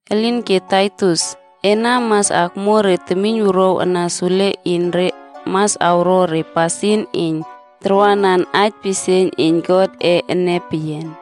Elinke Taitus, ena mas akmuo re temiynwuruaw ana sule iyn re mas awro re pasin iyn tarwanan aij pisieiyn iyn Godꞌe ene peyian.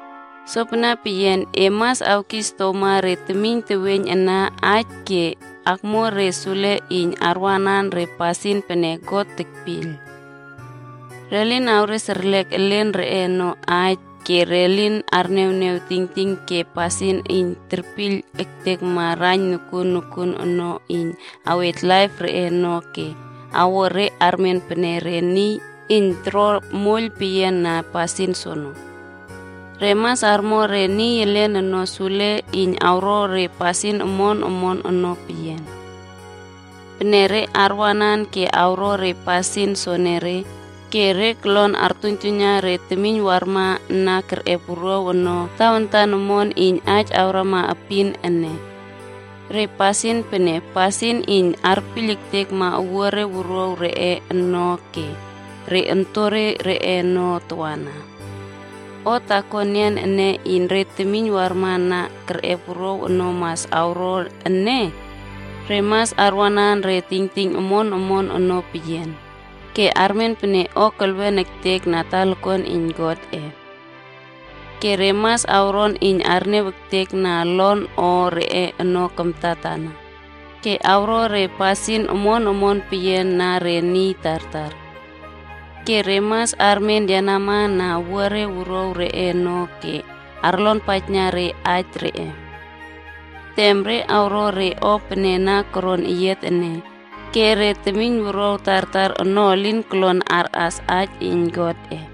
Sopene peyian, e mas awkis oktowma re temiyn teweiyn ana aij ke akmuo re sule iyn arwanan re pasin pene God tekpiyl. Re lin awres erlek re elen reꞌe ono aij ke re lin arniawniaw tingting ke pasin iyn terpiyl ektekma raiyn nokuon nokuon ono iyn awyiy laip reꞌe ono ke awo re armen pene re niy iyn toro moiyl peyiana pasin soono. Re mas armo re niy elen ono sule iyn awro re pasin omon omon ono peyian. Pene re arwanan ke awro re pasin soenere, ke re kolon artuiynjuiyna re temiyn warma na kerꞌep wuruaw ono tawantan omon iyn aij akrama epin ene. Re pasin pene, pasin iyn arpiyl ektekma owuare wuruaw reꞌe ono ke re ontore reꞌe ono tawana. O taako enian ene iyn re temiyn warma na kerꞌep wuruaw ono mas awro ene, Re mas arwanan re tingting omon omon ono peyian, ke armen pene o kelwen ektekma na talakuan iyn Godꞌe. Ke re mas awron iyn arniaw ektekna olon o reꞌe ono kamtatana, ke awro re pasin omon omon peyian na re niy tartar. Ke re mas armen yenama na owuare wuruaw reꞌe ono, ke arlonpaijna aij reꞌe. Tem re awro re o pene na koron eyiat ene, ke re temiynwuruaw tartar ono elin kolon arꞌas aij iyn Godꞌe.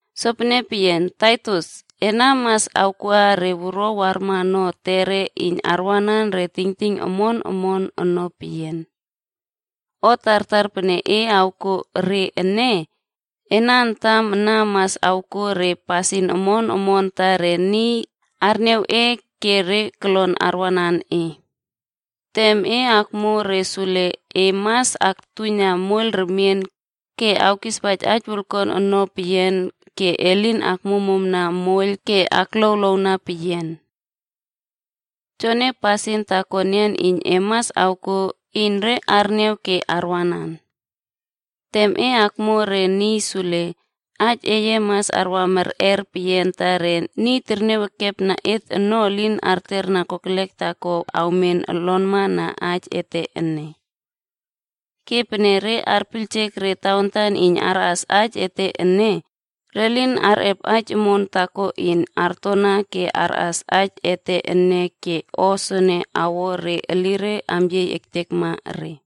Sopene peyian, Taitus, e mas awkuꞌa re wuruaw warma ono etere iyn arwanan re tingting omon omon ono peyian. O tartar pene e awkuo re ene, ena antam ana mas awkuo re pasin omon omon ta re niy arniaw e ke re kolon arwanan e. Tem e akmuo re sule, e mas aktuna moiyl remien ke awkispaij aij wolkuan ono peyian ke e lin akmuammuamna moiyl ke akluawluawna peyian. Joene pasin taako enian iyn e mas awkuo iyn re arniaw ke arwanan. Tem e akmuo re niy sule, aij eye mas arwa merꞌer peyian ta re niy terniaw ekepna et ono elin arterna kokelek taako awmen olonma na aij ete ene. Ke pene re arpiyljek re tawantan iyn arꞌas aij ete ene, re lin arꞌep aij omon taako iyn artona ke arꞌas aij ete ene ke o soene awo re elire amyiey ektekma re.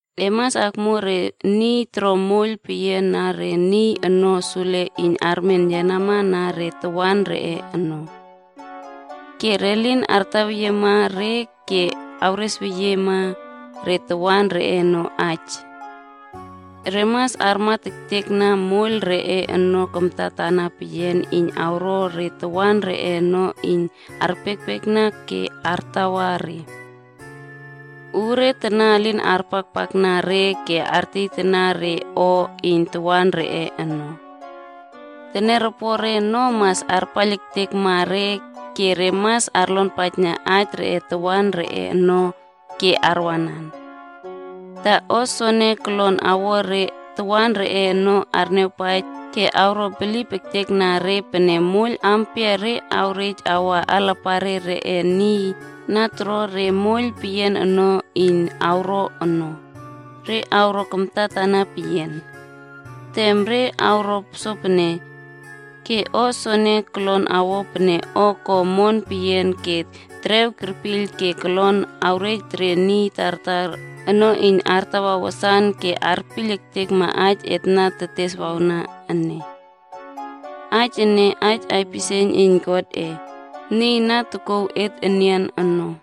E mas akmuo re niy toro moiyl peyian na re niy ono sule iyn armen yenama na re tawan reꞌe ono. Ke re lin artaweyiema re ke awresweyiema re tawan reꞌe ono aij. Re mas armat ektekna moiyl reꞌe ono kamtatana peyian iyn awro re tawan reꞌe ono iyn arpiekpiekna ke artawa re. Uure tana elin arpakpakna re ke artieytana re o iyn tawan reꞌe ono. Teniaropore ono mas arpaiyl ektekma re ke mas arlonpaijna aij reꞌe tawan reꞌe ono ke arwanan, ta o soene kolon awo re tawan reꞌe ono arniawpaij ke awro bilip ektekna re pene moiyl ampia re awrej awa alapare reꞌe niy na toro re moiyl peyian ono iyn awro ono, re awro kamtatana peyian. Tem re awro sopene, ke o soene kolon awo pene o ko omon peyian ke terew kerpiyl ke kolon awyiy re niy tartar ono iyn artawa wasan ke arpiyl ektekma aij et na teteswawna ene. Aij ene, aij aipisieiyn iyn God, niy na tokouw et enian ono.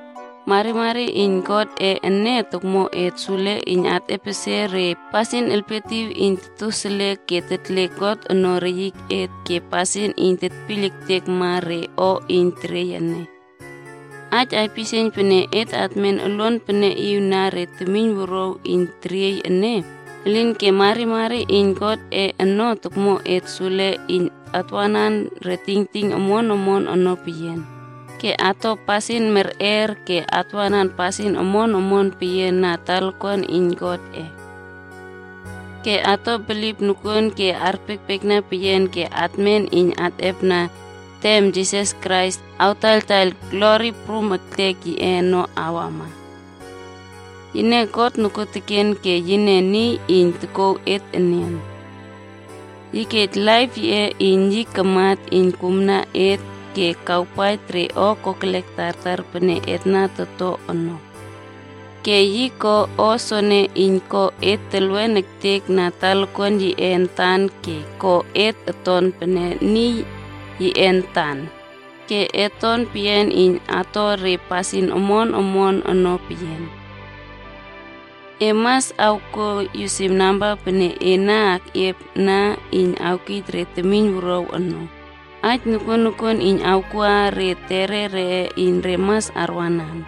Marimari iyn Godꞌe ene tokmo et sule iyn atꞌepesie re pasin elpietiw iyn totoseliek ke tetle God ono reyiket ke pasin iyn tetpiyl ektekma re o iyn teriey ene. Aij aipisieiyn pene etmen uluanpeneꞌiw na re temiynwuruaw iyn teriey ene, elinke marimari iyn Godꞌe ono tokmo et sule iyn atwanan re tingting omon omon ono peyian, ke ato pasin merꞌer, ke atwanan pasin omon omon peyian na talakuan iyn Godꞌe. Ke ato bilip nokuon ke arpiekpiekna peyian ke atmen iyn atꞌepna tem Jisas Krais awtaiyltaiyl glori prum ektek yiꞌe ono awama. Yine God nokuoteken ke yine niy iyn tokouw et enian. Yi kej laip yiꞌe iyn yi kamat iyn kumna et ke kawpaij re o kokelek tartar pene et to ono. Ke yi ko o soene iyn ko et telwen ektekma na talakuan yiꞌe antan ke ko et oton pene niy yiꞌe antan, ke et ton peyian iyn ato re pasin omon omon ono peyian. E mas awkuo yusim namba pene e na keꞌiep ana iyn awkij re temiynwuruaw ono, aij nokuon nokuon iyn awkuꞌa re etere reꞌe iyn re mas arwanan.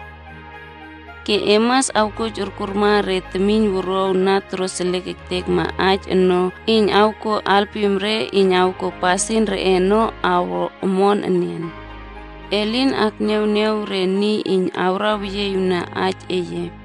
Ke e mas awkuoij okurma re temiynwuruaw na toroseliek ektekma aij ono iyn awkuo alpim re iyn awkuo pasin reꞌe ono awro omon enian. E lin akniawniaw re niy iyn awraweyieꞌiwna aij eye.